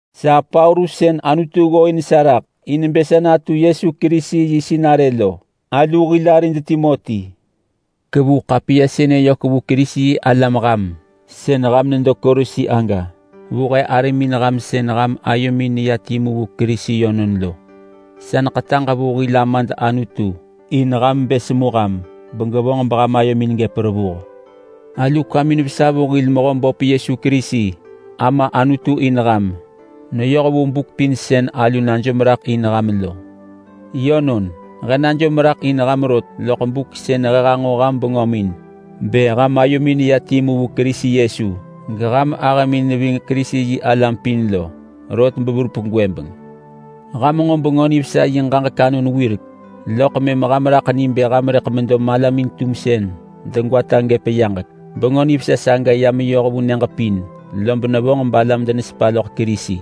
Sa Paulus sën Anutu ggooin sa raḳ in bë sa natu Kerisi Yesu yi sinarë lo. Alu hil arid Timoti ḳevu ḳapiya sënë yök vu Kerisi-yi-alam ham sën ham nedo Kolosi aga. Vu he arimin ham sën ham ayomin neya timu vu Kerisi yönon lo. Sa neḳetaġ vu hil Amad Anutu in ham bë semu ham begevonġ ham ayomin gëp revuh. Alu kwamin vesa vu hil Mehöböp Yesu Kerisi Ama Anutu in ham neyoh vu buk pin sën alu najom raḳ in ham lo. Yönon, he najom raḳ in ham rot loḳ buk sën he hanġo ham bengömin bë ham ayomin neya timu vu Kerisi Yesu geham ahëmin neving Kerisi-yi-alam pin lo, rot besën verup gwëbeng. Ham nġo Bengö Nivesa yi ġaġek anon wirek, loḳ mëm ham raḳ ni bë ham rëḳ medo malamin-tumsën degwata gëp yaġek. Bengö Nivesa saga ya meyoh vu nyëġ pin, lob nevonġ balam denesepa loḳ Kerisi.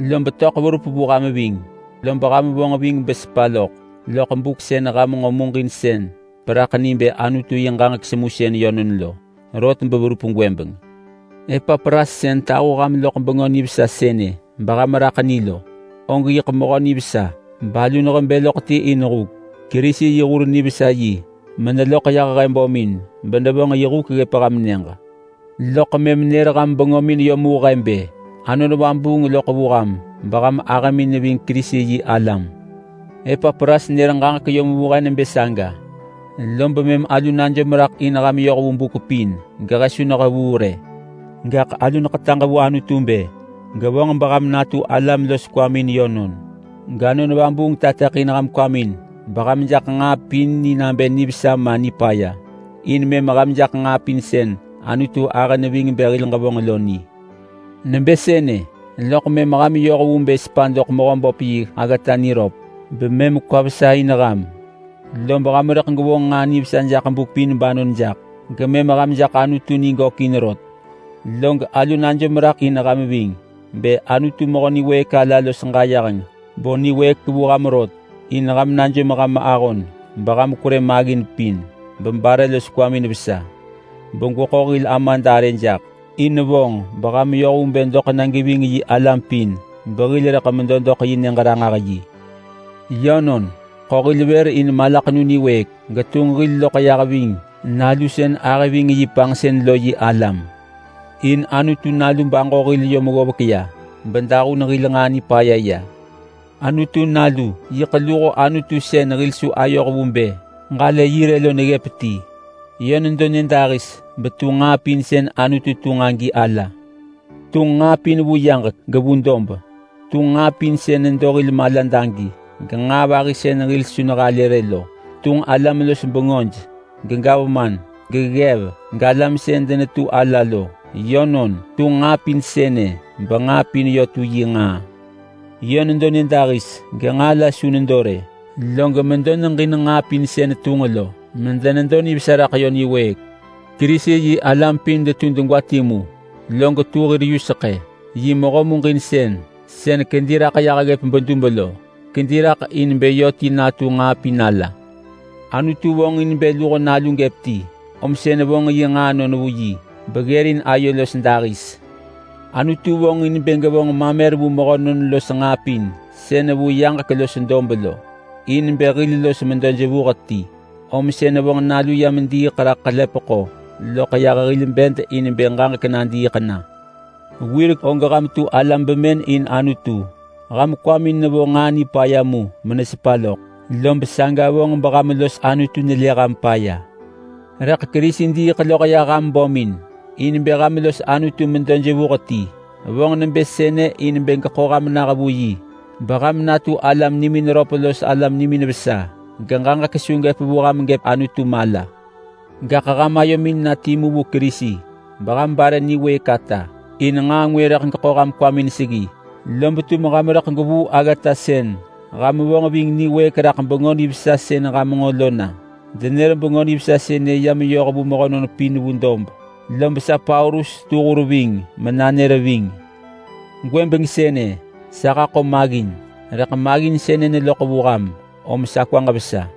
Lob töḳ verup vu ham ving, lob ham vonġ ving besepa loḳ loḳ buk sën ham nġo muġinsën beraḳ ni bë Anutu yi ġaġek semusën yönon lo, rot beverup gwëbeng. Epapras sën tahu ham loḳ Bengö Nivesa sënë beham raḳ ni lo, og yiḳ mehö nivesa balu nehebë loḳ ti in huk. Kerisi yi hur nivesa yi meneloḳ yah he bömin benevonġ yi huk ggëp ham nyëġ. Loḳ mëm nër ham bengömin yom vu he bë Anon Vabuung loḳ vu ham beham ahëmin neving Kerisi-yi-alam. Epapras nër ġaġek yom vu he nebë saga, lob mëm alu najom raḳ in ham yoh vu buk pin gehe su nehevuu rë. Gaḳ alu neḳetaġ vu Anutu bë gevonġ beham natu alam los kwamin yönon, gAnon Vabuung tateḳin ham kwamin beham jaḳ nġaa pin ni nabë nivesa ma nipaya. In mëm ham jaḳ nġaa pin sën Anutu ahë neving bë hil ġevonġ lo ni. Nabë sënë, loḳ mëm ham yoh vu bë sepa doḳ Mehöböp yi aggata niröp bemëm kwa vesa in ham. Lob ham rëḳ gwevonġ nġaa nivesa jaḳ buk pin banon jaḳ, gemëm ham jaḳ Anutu ni gökin rot. Log alu najom raḳ in ham ving bë Anutu mehö niwëëk ala los ġayeheng bo niwëëk vu ham rot in ham najom ham ahon beham kwerë maggin pin bebare los kwamin vesa begweḳo hil Amad arë jaḳ. In vonġ beham yoh vu bë doḳ na geving yi alam pin behil rëḳ medo doḳ yi Nyëġ-ranġah-yi. Yönon, ḳo hil vër in malaḳenu niwëëk, getunġ hil loḳ ya ving Nalu sën ahë ving yi panġsën lo yi alam. In Anutu Nalu baġo hil yom ggovek ya bedahun hil nġaa nipaya ya. Anutu Nalu yiḳ luho Anutu sën hil su ayoh vu bë ġalë yi rë lo neggëp ti. Yö nedo nyëdahis betu nġaa pin sën Anutu tunġ agi ala. Tunġ nġaa pin vu yaġek gevu dob. Tunġ nġaa pin sën nedo hil malad agi, genġaa vahi sën hil su nehalë rë lo. Tunġ alam-los-bengöj, gegavman, geggev, galam sën denetu ala lo. Yönon, tunġ nġaa pin sënë benġaa pin yö tu yi nġaa. Yö nedo nyëdahis genġaa la su nedo rë, log medo neġin nġaa pin sën tunġ lo medenedo nivesa raḳ yö niwëëk. Kerisi-yi-alam pin detu degwa timu log tu hir yuseḳë. Yi mehö muġinsën sën kedi raḳ yah ggëp bedub lo. Kedi raḳ in bë yö ti natu nġaa pin ala. Anutu vonġin bë luho Nalu gëp ti, om sën vonġ yi nġaanon vu yi beggërin ayo los dahis. Anutu vonġin bë gevonġ mamer vu mehönon los nġaa pin sën vu yaġek los dob lo, in bë hil los medo jevuh ti. Om sën vonġ Nalu yam bediiḳ raḳ ḳelepeḳo loḳ yah hil bed in bë ġaġek nadiiḳ na. Wirek og ham tu alam bemën in Anutu. Ham kwamin nevo nġaa nipaya mu menesepa loḳ, lob saga vonġ beham los Anutu nelë ham paya. Rëḳ Kerisi diiḳ loḳ yah ham bömin in bë ham los Anutu medo jevuh ti. Vonġ nebë sënë in bë geḳo ham nah vu yi beham natu alam nimin röp los alam nimin vesa geġaġek su gëp vu ham gëp Anutu mala. Gaḳ ham ayomin na timu vu Kerisi beham bare niwëëk ata. In nġaa ngwë rëḳ geḳo ham kwamin seggi lob tum ham rëḳ gwevuu aggata sën ham vonġ ving niwëëk raḳ Bengö Nivesa sën ham nġo lo na. Denër Bengö Nivesa sënë ya meyoh vu mehönon pin vu dob, lob sa Paulus setu hur ving menanër ving. Gwëbeng sënë sa haḳo maggin, rëḳ maggin sënë neloḳ vu ham om sa kwaġ vesa.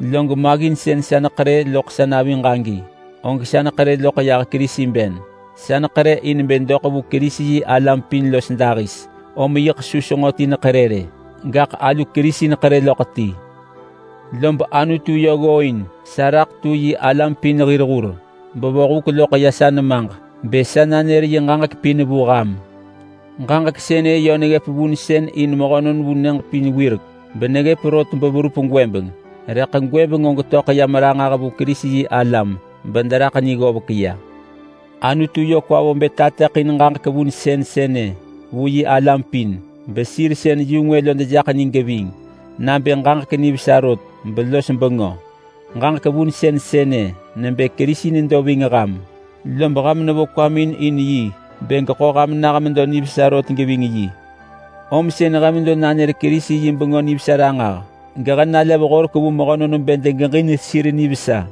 Log maggin sën sa neḳerë loḳ sa naviġ agi, og sa neḳerë loḳ yah Kerisi ben. Sa neḳerë in bë doḳ vu Kerisi-yi-alam pin los dahis, om yiḳ su senġo ti neḳerë rë, gaḳ alu Kerisi neḳerë loḳ ti. Lob Anutu yö ggooin sa raḳ tu yi alam pin hir hur bevo huk loḳ sa nemaġ bë sa nanër yi ġaġek pin vu ham. Ġaġek sënë yö neggëp vunsën in mehönon vu nyëġ pin wirek, beneggëp rot beverup gwëbeng. Rëḳ gwëbeng og töḳ yam ranġah vu Kerisi-yi-alam bederaḳ ni ggovek ya. Anutu yö kwa vo bë tateḳin ġaġek vunsën sënë vu yi alam pin, besir sën yu-ngwë lo dejaḳ ni geving nabë ġaġek nivesa rot belos bengö. Ġaġek vunsën sënë nebë Kerisi nedo ving ham, lob ham nevo kwamin in yi bë geḳo ham nah medo nivesa rot geving yi. Om sën he medo nanër Kerisi yi Bengö Nivesa ranġah gehe nalev horek vu mehönon bë degeġin sir nivesa.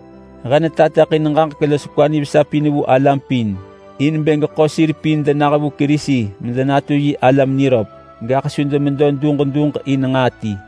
He netateḳin ġaġek los kwa nivesa pin vu alam pin in bë ġaḳo sir pin denah vu Kerisi medenatu yi alam niröp, gaḳ su demedo duġ duġ in nġaa ti.